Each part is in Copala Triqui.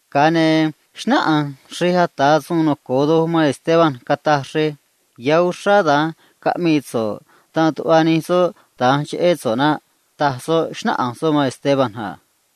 Ga̱a ne̱ xnáꞌanj xrej ata̱ suun noco̱o doj man síí cuꞌna̱j Esteban, cataj xrej a: ―Ya̱ uxrá da̱nj caꞌmii so̱ꞌ dan tuꞌva nij soꞌ da̱nj cheꞌé so̱ꞌ naꞌ ―taj soꞌ, xnáꞌanj soꞌ man Esteban a.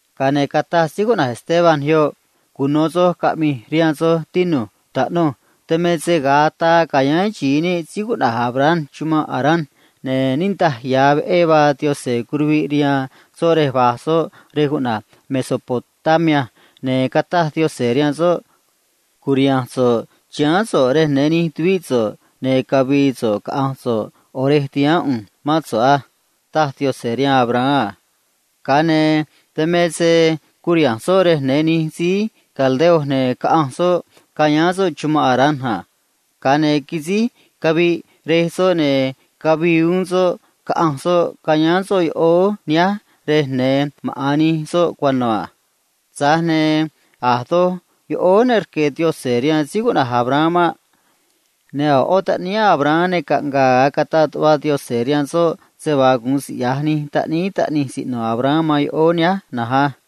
Ga̱a ne̱ cataj Esteban yoꞌ a: ―Cuno̱ soj caꞌmi̱j rihaan soj, tinu̱j, taꞌnuj. Dan me se ga̱a ataa ca̱yáán xi̱i níꞌ síí cuꞌna̱j Abraham chumanꞌ Harán, ne̱ Yaꞌanj niꞌndaj ya̱ sa̱ꞌ veꞌé vaa curuviꞌ rihaan soꞌ rej cuꞌna̱j Mesopotamia a. Ne̱ cataj Yaꞌanj rihaan soꞌ a: “Cu̱riha̱nj so̱ꞌ chiháán so̱ꞌ rej ya̱nj nij tuvíꞌ so̱ꞌ, ne̱ cavi̱i̱ so̱ꞌ caꞌa̱nj so̱ꞌ ꞌo̱ rej ti̱haán ꞌu̱nj mán so̱ꞌ á”, taj Yaꞌanj rihaan Abraham a. Dan me se curiha̱nj soꞌ rej ya̱nj nij síí caldeo, ne̱ caꞌanj soꞌ cayáán soꞌ chumanꞌ Harán a. Ga̱a ne̱ quisíj caviꞌ rej soꞌ, ne̱ quiꞌyaj Yaꞌanj se vaa cavii uún soꞌ, caꞌanj soꞌ cayáán soꞌ yoꞌóó nihánj rej ya̱nj maꞌa̱n nij soj cuano̱ a. Tza̱j ne̱ a̱ doj yoꞌóó ne rque̱ Yaꞌanj rihaan Abraham maꞌ. Ne̱ a̱ ꞌó taꞌníí Abraham ne caꞌnga̱a̱ ga̱a cataꞌ tuꞌva Yaꞌanj rihaan soꞌ se vaa gu̱un siꞌya̱j nij taꞌníí taꞌnij siꞌno̱ Abraham man yoꞌóó nihánj maꞌ.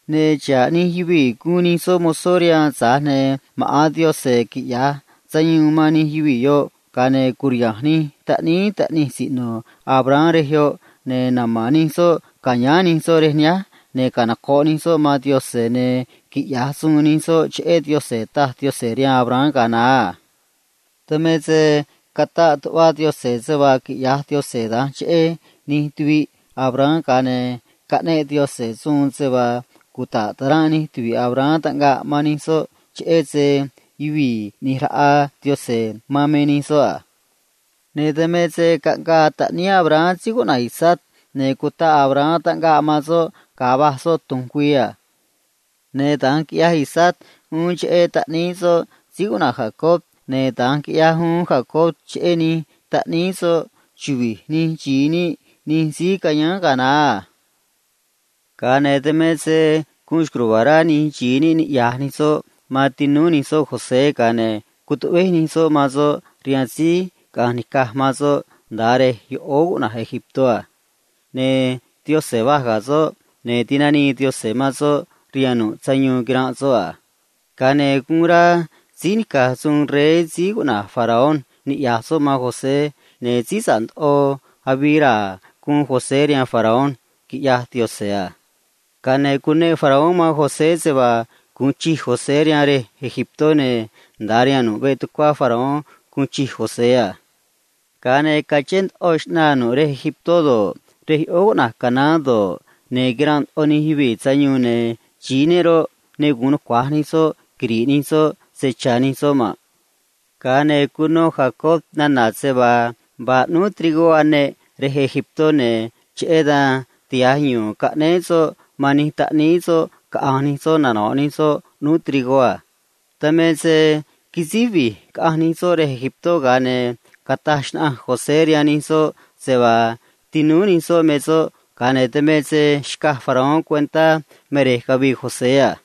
Ne̱ xa̱ꞌ nij yuvii̱ gu̱un nij soꞌ mozó rihaan, tza̱j ne̱ ma̱ꞌán ꞌu̱nj quiꞌya̱j sayuun man nij yuvii̱ yoꞌ, ga̱a ne̱ cu̱riha̱nj nij taꞌníí taꞌnij siꞌno̱ so̱ꞌ rej yoꞌ a. Ne̱ nama̱n nij soꞌ ca̱yáán nij soꞌ rej nihánj, ne̱ canoco̱ꞌ nij soꞌ mán ꞌu̱nj, ne̱ cara̱a̱ gue̱e̱ nij soꞌ rihaan ꞌu̱nj a”, taj Yaꞌanj rihaan Abraham ga̱a naá a. ’Dan me se cataꞌ tuꞌva Yaꞌanj se vaa quiꞌya̱j Yaꞌanj da̱nj cheꞌé nij tuviꞌ Abraham, ga̱a ne̱ caꞌneꞌ Yaꞌanj suun se vaa cuta̱ꞌ ta̱ranꞌ nij tuvi̱ꞌ Abraham taꞌngaꞌ man nij soꞌ, cheꞌé se yuvii̱ ꞌni̱j raꞌa Yaꞌanj man me nij soꞌ a. Ne̱ dan me se caꞌngaa taꞌníí Abraham síí cuꞌna̱j Isaac, ne̱ cutaꞌ Abraham taꞌngaꞌ man soꞌ ga̱a va̱j soꞌ tu̱nj güii a. Ne̱ da̱nj quiꞌyaj Isaac uún cheꞌé taꞌníí soꞌ síí cuꞌna̱j Jacob, ne̱ da̱nj quiꞌyaj Jacob uún cheꞌé nij taꞌníí soꞌ chuvi̱j nij xi̱i níꞌ nij síí cayáán ga̱a naá a. ’Dan me se guun xco̱j ruva̱a̱ rá nij xi̱i níꞌ niꞌya̱j nij soꞌ man tinúú nij soꞌ José, ga̱a ne̱ cutuꞌvéj nij soꞌ man soꞌ rihaan síí caꞌanj nica̱j man soꞌ nda̱a rej yoꞌóó noco̱o cuꞌna̱j Egiptó a. Tza̱j ne̱ Yaꞌanj va̱j ga̱ soꞌ, ne̱ tinanii Yaꞌanj man soꞌ rihaan nu̱ꞌ sayuun quiranꞌ soꞌ a. Ga̱a ne̱ guun rá síí nica̱j suun rey síí cuꞌna̱j Faraón niꞌya̱j soꞌ man José, ne̱ síí sa̱ꞌ ndoꞌo avii raa̱ guun José rihaan Faraón, quiꞌyaj Yaꞌanj a. Ga̱a ne̱ cuneꞌ Faraón man José se vaa gu̱un chij José rihaan yoꞌóó Egiptó, ne̱ nda̱a rihaan nu̱ꞌ veꞌ tucuá Faraón guun chij José a. ’Ga̱a ne̱ cachén ndoꞌo xꞌnaa nu̱ꞌ yoꞌóó Egiptó do̱ꞌ, rej yoꞌóó cuꞌna̱j Canaán do̱ꞌ, ne̱ quiranꞌ ndoꞌo nij yuvii̱ sayuun, ne̱ xi̱i níꞌ roꞌ, ne gu̱un nucua̱j nij soꞌ quiri̱ꞌ nij soꞌ se cha̱ nij soꞌ maꞌ. Ga̱a ne̱ cuno Jacob nana̱ se vaa vaa ꞌnúú trigó aneꞌ yoꞌóó Egiptó, ne̱ cheꞌé dan tiha̱j yu̱u̱n caꞌnéé soꞌ man nij taꞌníí soꞌ caꞌa̱nj nij soꞌ nano̱ꞌ nij soꞌ ꞌnúú trigó a. Dan me se quisíj vi̱j caꞌanj nij soꞌ yoꞌóó Egiptó, ga̱a ne̱ cataj xnaꞌanj José rihaan nij soꞌ se vaa tinúú nij soꞌ me soꞌ, ga̱a ne̱ xcaj Faraón cuentá me xꞌneꞌ yuvii̱ cavii José a.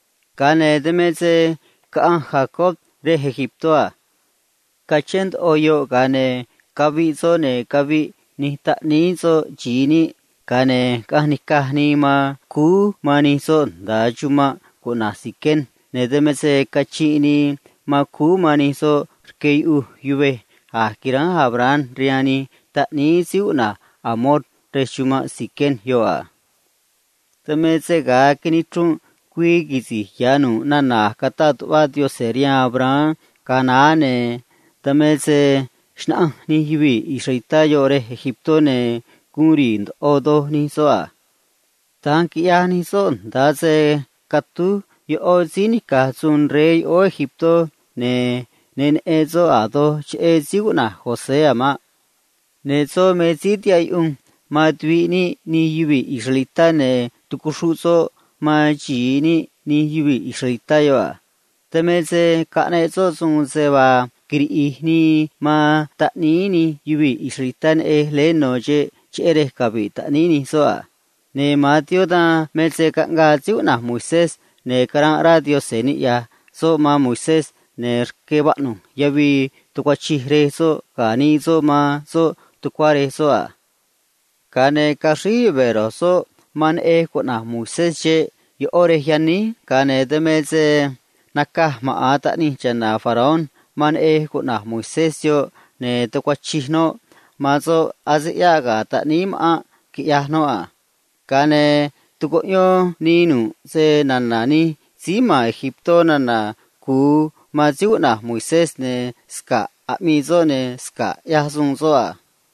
Ga̱a ne̱ dan me se caꞌanj Jacob yoꞌóó Egiptó a. Cachén doj, ga̱a ne̱ caviꞌ soꞌ, ne̱ caviꞌ nij taꞌníí soꞌ xi̱i níꞌ, ga̱a ne̱ caꞌanj nica̱j nii man cúú man nij soꞌ nda̱a chumanꞌ cuꞌna̱j Siquem a. Ne̱ dan me se cachinꞌ nii cúú man nij soꞌ rque yuꞌuj yuvej a̱j quiránj Abraham rihaan nij taꞌníí síí cuꞌna̱j Hamor rej chumanꞌ Siquem yoꞌ a. ’Dan me se ga̱a nichrunꞌ güii quisi̱j ya̱ nu̱ꞌ nana̱ a̱j cataꞌ tuꞌva Yaꞌanj rihaan Abraham ga̱a naá, ne̱ dan me se xnaꞌanj nij yuvii̱ israelitá yoꞌ yoꞌóó Egiptó, ne̱ guun ri̱i̱ ndoꞌo doj nij soꞌ a. Da̱nj quiꞌyaj nij soꞌ nda̱a se catúj ꞌó síí nica̱j suun rey yoꞌóó Egiptó, ne̱ ne neꞌen soꞌ a̱ doj cheꞌé síí cuꞌna̱j José a̱ maꞌ. Ne̱ soꞌ me síí tihaꞌ yuꞌunj man tuviꞌ níꞌ nij yuvii̱ israelitá, ne̱ tucuxruꞌ soꞌ man xi̱i níꞌ nij yuvii̱ israelitá yoꞌ a. Dan me se caꞌneꞌ soꞌ suun se vaa quiriꞌi̱j nii man taꞌníí nij yuvii̱ israelitá leé no̱ xeꞌ, cheꞌé yan cavi̱ꞌ nij neꞌej a. Ne̱ ma̱an tiempó dan me se caꞌngaa síí cuꞌna̱j Moisés, ne̱ caranꞌ rá Yaꞌanj niꞌya̱j soꞌ man Moisés, ne̱ rque vaꞌnu̱j yavii tucuachij rej soꞌ ga̱ nii soꞌ man soꞌ tucuá rej soꞌ a. Ga̱a ne̱ caxríj yuve̱ ro̱j soꞌ man neꞌej cuꞌna̱j Moisés xeꞌ ꞌó rej yaníj, ga̱a ne̱ naca̱j maꞌa̱n taꞌnij cha̱na̱ Faraón man neꞌej cuꞌna̱j Moisés yoꞌ, ne̱ tucuachij noꞌ man soꞌ, ne̱ ase ꞌyáꞌ ga̱ taꞌníí ma̱ꞌánꞌ quiꞌyaj noꞌ a. Ga̱a ne̱ tucuꞌyón nii nu̱ꞌ snana̱ nij síí ma̱n yoꞌóó Egiptó nana̱ cu̱u man Moisés, ne̱ sca̱ꞌ aꞌmii soꞌ ne̱ sca̱ꞌ ꞌyaj soꞌ a.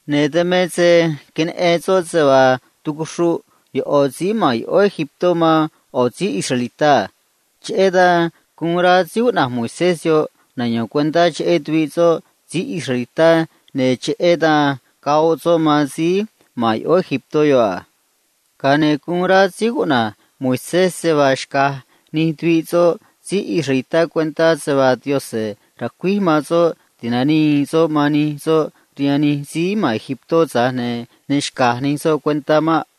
Ne̱ dan me se queneꞌen soꞌ se vaa tucuxruꞌ ꞌo̱ síí ma̱n yoꞌóó Egiptó man ꞌo̱ síí israelitá a. Cheꞌé dan guun rá Moisés yoꞌ nayo̱n cuentá cheꞌé tuviꞌ soꞌ síí israelitá, ne̱ cheꞌé dan goꞌ soꞌ man síí ma̱n yoꞌóó Egiptó yoꞌ a. Ga̱a ne̱ guun rá Moisés se vaa xca̱j nij tuviꞌ soꞌ síí israelitá cuentá se vaa Yaꞌanj ra̱cuíj man soꞌ ti̱nanii soꞌ man nij soꞌ rihaan nij síí ma̱n yoꞌóó Egiptó, tza̱j ne̱ ne xca̱j nij soꞌ cuentá maꞌ.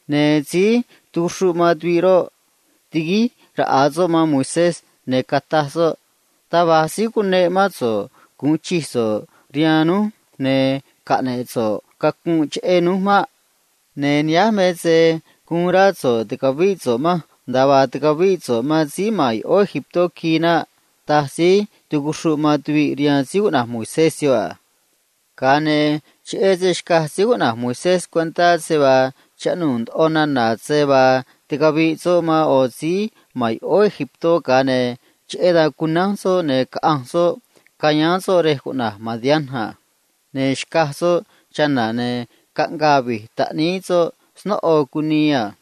Ne̱ síí tucuxruꞌ man tuviꞌ roꞌ, tiguíj raꞌa soꞌ man Moisés, ne̱ cataj soꞌ a: “Taj va̱j síí cuneꞌ mán so̱ꞌ gu̱un chij so̱ꞌ rihaan núj ne̱ caꞌne̱ꞌ so̱ꞌ cacunꞌ cheꞌé núj maꞌ. Ne̱ nihánj me se uun rá so̱ꞌ ti̱cavíꞌ so̱ꞌ manj, nda̱a vaa ticavíꞌ so̱ꞌ man síí ma̱n yoꞌóó Egiptó quii naꞌ”, taj síí tucuxruꞌ man tuviꞌ rihaan Moisés yoꞌ a. Ga̱a ne̱ cheꞌé se xcaj Moisés cuentá se vaa chaꞌnuu̱ ndoꞌo nana̱ se vaa ticaviꞌ soꞌ man ꞌo̱ síí ma̱n yoꞌóó Egiptó, ne̱ cheꞌé dan cunánj soꞌ, ne̱ caꞌanj soꞌ cayáán soꞌ nda̱a yoꞌóó cuꞌna̱j Madián a. Ne̱ xcaj soꞌ chana̱, ne̱ caꞌngaa vi̱j taꞌníí soꞌ snóꞌo cunii a.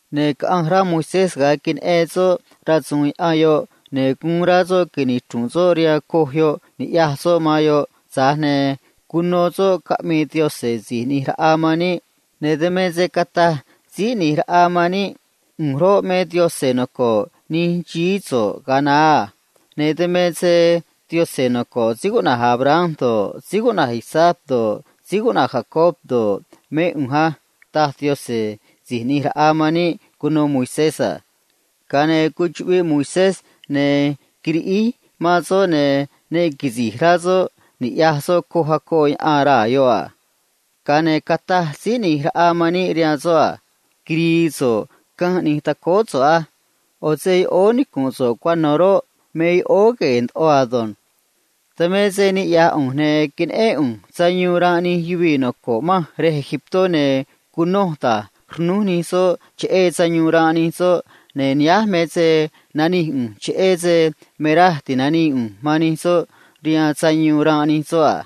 Ne̱ caꞌanj rá Moisés cheꞌé se vaa queneꞌen soꞌ, ne̱ guun rá soꞌ nichru̱nꞌ soꞌ rihaan coj yoꞌ ni̱ꞌyaj soꞌ man yoꞌ a. Ga̱a ne̱ cuno soꞌ caꞌmii Síí ꞌNi̱j Raꞌa man níꞌ, ne̱ dan me se cataj Síí ꞌNi̱j Raꞌa man níꞌ a: “ꞌU̱nj roꞌ, me Yaꞌanj noco̱ꞌ nij xií so̱ꞌ ga̱a naá a. Dan me se Yaꞌanj noco̱ꞌ síí cuꞌna̱j Abraham do̱ꞌ, Isaac do̱ꞌ, Jacob do̱ꞌ, mé ꞌu̱nj á”, taj Yaꞌanj Si̱j ꞌNi̱j Raꞌa man níꞌ cuno Moisés a. Ga̱a ne̱ cuchuꞌviꞌ Moisés ne̱ quiriꞌíj man soꞌ, ne̱ ne quisi̱j rá soꞌ ni̱ꞌyaj soꞌ coj acoꞌ yaꞌan raa̱ yoꞌ a. Ga̱a ne̱ cataj Síí ꞌNi̱j Raꞌa man níꞌ rihaan soꞌ a: “Quiri̱i̱ so̱ꞌ canj ꞌni̱j tacóó so̱ꞌ á. ꞌO̱ se yoꞌóó nicu̱nꞌ so̱ꞌ cuano̱ roꞌ, me yoꞌóó gue̱e̱ ndoꞌo ado̱nj. Dan me se niꞌya̱j ꞌu̱nj, ne̱ queneꞌén ꞌu̱nj sayuun ranꞌ nij yuvii̱ noco̱ꞌ manj yoꞌóó Egiptó, ne̱ cunoj da̱j rnúj nij soꞌ cheꞌé sayuun ranꞌ nij soꞌ a. Ne̱ nihánj me se nanij ꞌu̱nj cheꞌé yan ti̱nanii ꞌu̱nj man nij soꞌ rihaan sayuun yoꞌ ado̱nj.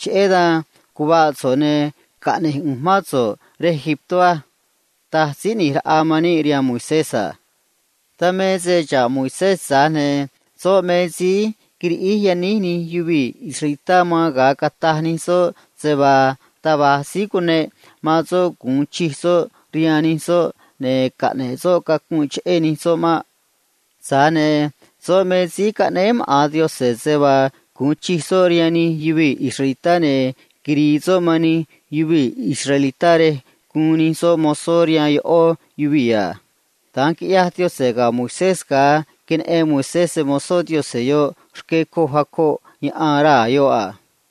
Cheꞌé dan caꞌna̱ꞌ so̱ꞌ, ne̱ caꞌne̱j ꞌu̱nj mán so̱ꞌ nda̱a yoꞌóó Egiptó á”, taj Síí ꞌNi̱j Raꞌa man níꞌ rihaan Moisés a. ’Dan me se xa̱ꞌ Moisés, tza̱j ne̱ soꞌ me síí quiriꞌíj yaníj nij yuvii̱ israelitá man ga̱a cataj nij soꞌ se vaa taj va̱j síí cuneꞌ man soꞌ gu̱un chij soꞌ rihaan nij soꞌ ne̱ caꞌne̱ꞌ soꞌ cacunꞌ cheꞌé nij soꞌ maꞌ. Tza̱j ne̱ soꞌ me síí caꞌnéé maꞌa̱n Yaꞌanj se vaa gu̱un chij soꞌ rihaan nij yuvii̱ israelitá ne̱ quiri̱i̱ soꞌ man nij yuvii̱ israelitá rej guun nij soꞌ mozó rihaan ꞌó yuvii̱ a. Da̱nj quiꞌyaj Yaꞌanj ga̱ Moisés ga̱a curiha̱nj síí caꞌnéé Yaꞌanj yoꞌ rque coj acoꞌ yaꞌan raa̱ yoꞌ a.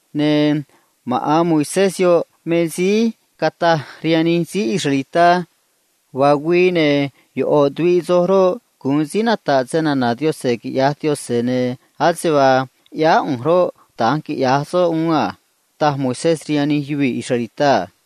Ne̱ maꞌa̱n Moisés yoꞌ me síí cataj rihaan nij síí israelitá a: “Vaa güii, ne̱ ꞌo̱ tuviꞌ soj roꞌ, gu̱un síí nata̱ꞌ snana̱ Yaꞌanj, quiꞌya̱j Yaꞌanj, ne̱ ase vaa ꞌyáá ꞌu̱nj roꞌ, da̱nj quiꞌya̱j soꞌ uún a”, taj Moisés rihaan nij yuvii̱ israelitá a.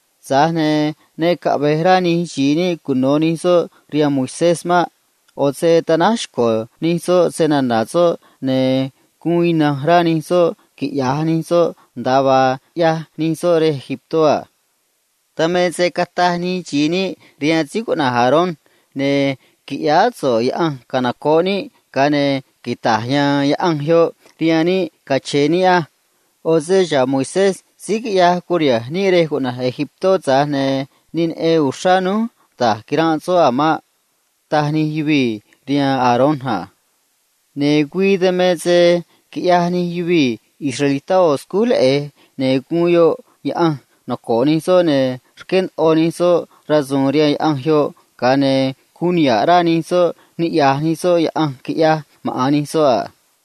’Tza̱j ne̱ ne caꞌve̱j rá nij xi̱i níꞌ cuno̱ nij soꞌ rihaan Moisés maꞌ. ꞌO̱ se tanáj xco̱ nij soꞌ snana̱ soꞌ, ne̱ guun ina̱nj rá nij soꞌ quiꞌya̱j nij soꞌ nda̱a vaa ꞌyaj nij soꞌ yoꞌóó Egiptó a. Dan me se cataj nij xi̱i níꞌ rihaan síí cuꞌna̱j Aarón a: “Qui̱ꞌyáá so̱ꞌ yaꞌanj canoco̱ꞌ níꞌ, ga̱a ne̱ quita̱j ya̱a̱n yaꞌanj yoꞌ rihaan níꞌ cache̱e̱ níꞌ á. ꞌO̱ se xa̱ꞌ Moisés síí quiꞌyaj curiha̱nj níꞌ yoꞌóó Egiptó, tza̱j ne̱ ne neꞌen uxrá núj da̱j quiranꞌ soꞌ a̱ maꞌ”, taj nij xi̱i níꞌ rihaan Aarón a. Ne̱ güii dan me se quiꞌyaj nij yuvii̱ israelitá ꞌo̱ agaꞌ scúj leꞌe̱j, ne̱ guun yoꞌ yaꞌanj noco̱ꞌ nij soꞌ a. Ne̱ rqué ndoꞌo nij soꞌ rasu̱u̱n rihaan yaꞌanj yoꞌ, ga̱a ne̱ guun niha̱ꞌ rá nij soꞌ niꞌya̱j nij soꞌ yaꞌanj quiꞌyaj maꞌa̱n nij soꞌ a.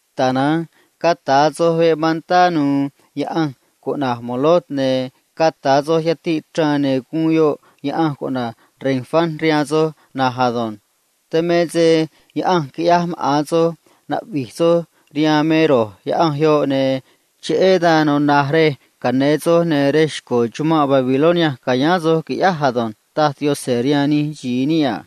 Tana̱nj cata̱ soj veꞌ mantá nu̱u̱ yaꞌanj cuꞌna̱j Moloc, ne̱ cata̱ soj yatiꞌ chraan, ne̱ guun yoꞌ yaꞌanj cuꞌna̱j Renfán rihaan soj na̱nj ado̱nj. Dan me se yaꞌanj quiꞌyaj maꞌa̱n soj cara̱a̱ gue̱e̱ soj rihaan me ro̱j yaꞌanj yoꞌ, ne̱ cheꞌé dan natuna̱j rej ca̱yáán soj, ne̱ rej xco̱ chumanꞌ Babilonia ca̱yáán soj, qui̱ꞌyáj ado̱nj, taj Yaꞌanj rihaan nij xi̱i níꞌ a.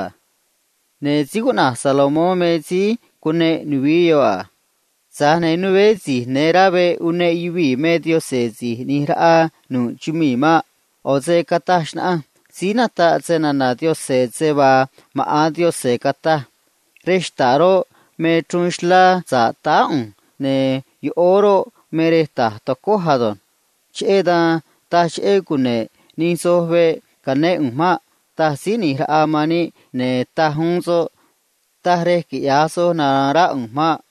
Tza̱j ne̱ rey cuꞌna̱j Salomón me síí cuneꞌ nuvií yoꞌ a. Tza̱j ne̱ né si̱j ya̱nj rá veꞌ uneꞌ yuvii̱ me Yaꞌanj Si̱j Uun Chij Doj maꞌ. ꞌO̱ se cataj xnaꞌanj síí nataꞌ snana̱ Yaꞌanj se vaa maꞌa̱n Yaꞌanj cataj a: Rej xta̱ꞌ roꞌ, me chruun xlá sa̱ꞌ táá ꞌu̱nj, ne̱ chumii̱ roꞌ, me rej ta̱j tacój ado̱nj. Cheꞌé dan taj cheꞌé cune̱ꞌ nij soj veꞌ ca̱yáán ꞌu̱nj maꞌ, taj Síí ꞌNi̱j Raꞌa man níꞌ a. Ne̱ taj uún soꞌ a: Taj rej quiꞌya̱j soj nara̱a̱n rá ꞌu̱nj maꞌ.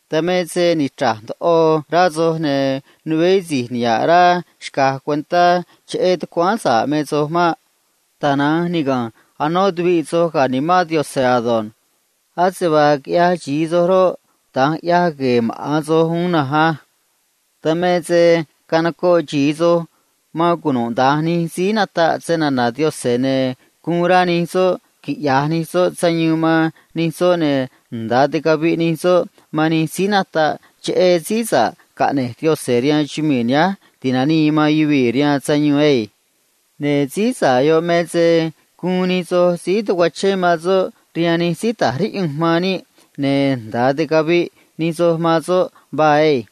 ’Dan me se nichra̱j ndoꞌo rá soj, ne̱ né si̱j niha̱ꞌ rá xca̱j cuentá cheꞌé tucuáán sa̱ꞌ me soj maꞌ. Tana̱nj niga̱nj naquiꞌyaj ꞌe̱e̱ soj man soj rihaan Nimán Yaꞌanj ado̱nj. Ase vaa quiꞌyaj xi̱i soj roꞌ, da̱nj ꞌyaj gue̱e̱ maꞌa̱n soj uún na̱nj á. Dan me se canocoꞌ xi̱i soj man cunuda̱nj nij síí nataꞌ snana̱ Yaꞌanj, ne̱ guun rá nij soꞌ quiꞌya̱j nij soꞌ sayuun man nij síí nataꞌ snana̱ Yaꞌanj a. Ne̱ nda̱a ticaviꞌ nij soꞌ man nij síí nataꞌ cheꞌé Síí Nica̱ Nimán caꞌne̱j Yaꞌanj rihaan chumii̱ nihánj ti̱nanii man yuvii̱ rihaan sayuun ado̱nj. Ne̱ Síí Nica̱ Nimán yoꞌ me se guun nij soj síí tacuachén man soꞌ rihaan nij síí ta̱j riꞌyunj man níꞌ, ne̱ nda̱a ticaviꞌ nij soj man soꞌ vaa asânj.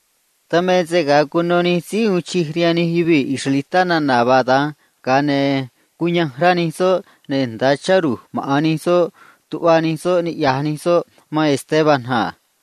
Dan me se ga̱a cuno nij síí uun chij rihaan nij yuvii̱ israelitá nana̱ vaa da̱nj, ga̱a ne̱ cuyanj rá nij soꞌ, ne̱ nda̱a chá ru̱j maꞌa̱n nij soꞌ cúú yanꞌ nij soꞌ niꞌya̱j nij soꞌ man Esteban a.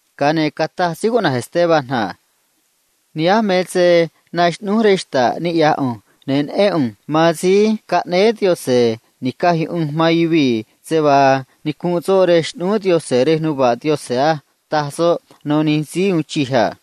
Ga̱a ne̱ cataj Esteban a: ―Ni̱ꞌyaj soj á. Naxꞌnúj rej xta̱ꞌ niꞌya̱j ꞌu̱nj, ne̱ neꞌén ꞌu̱nj man Síí Caꞌnéé Yaꞌanj Ni̱caj Yuꞌunj man Yuvii̱ se vaa nicunꞌ soꞌ rej xꞌnúú Yaꞌanj rej nuva̱ꞌ Yaꞌanj á ―taj soꞌ rihaan nij síí uun chij a.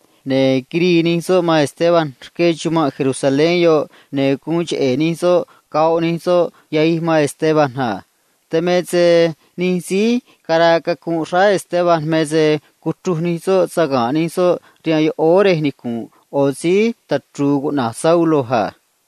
Ne̱ quirii nij soꞌ man Esteban rque chumanꞌ Jerusalén yoꞌ, ne̱ guun cheꞌe̱ nij soꞌ goꞌ nij soꞌ yahij man Esteban a. Dan me se nij síí caraa cacunꞌ xráá Esteban me se cuchruj nij soꞌ saga̱nꞌ nij soꞌ rihaan yoꞌóó rej nicu̱nꞌ ꞌo̱ síí tachru̱u̱ cuꞌna̱j Saulo a.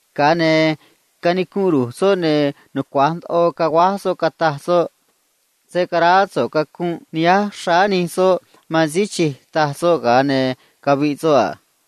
Ga̱a ne̱ canicunꞌ ru̱j soꞌ, ne̱ nucua̱j ndoꞌo caguáj soꞌ, cataj soꞌ a: ―Señor, se̱ caraá so̱ꞌ cacunꞌ nihánj xráá nij soꞌ maꞌ ―taj soꞌ, ga̱a ne̱ caviꞌ soꞌ a.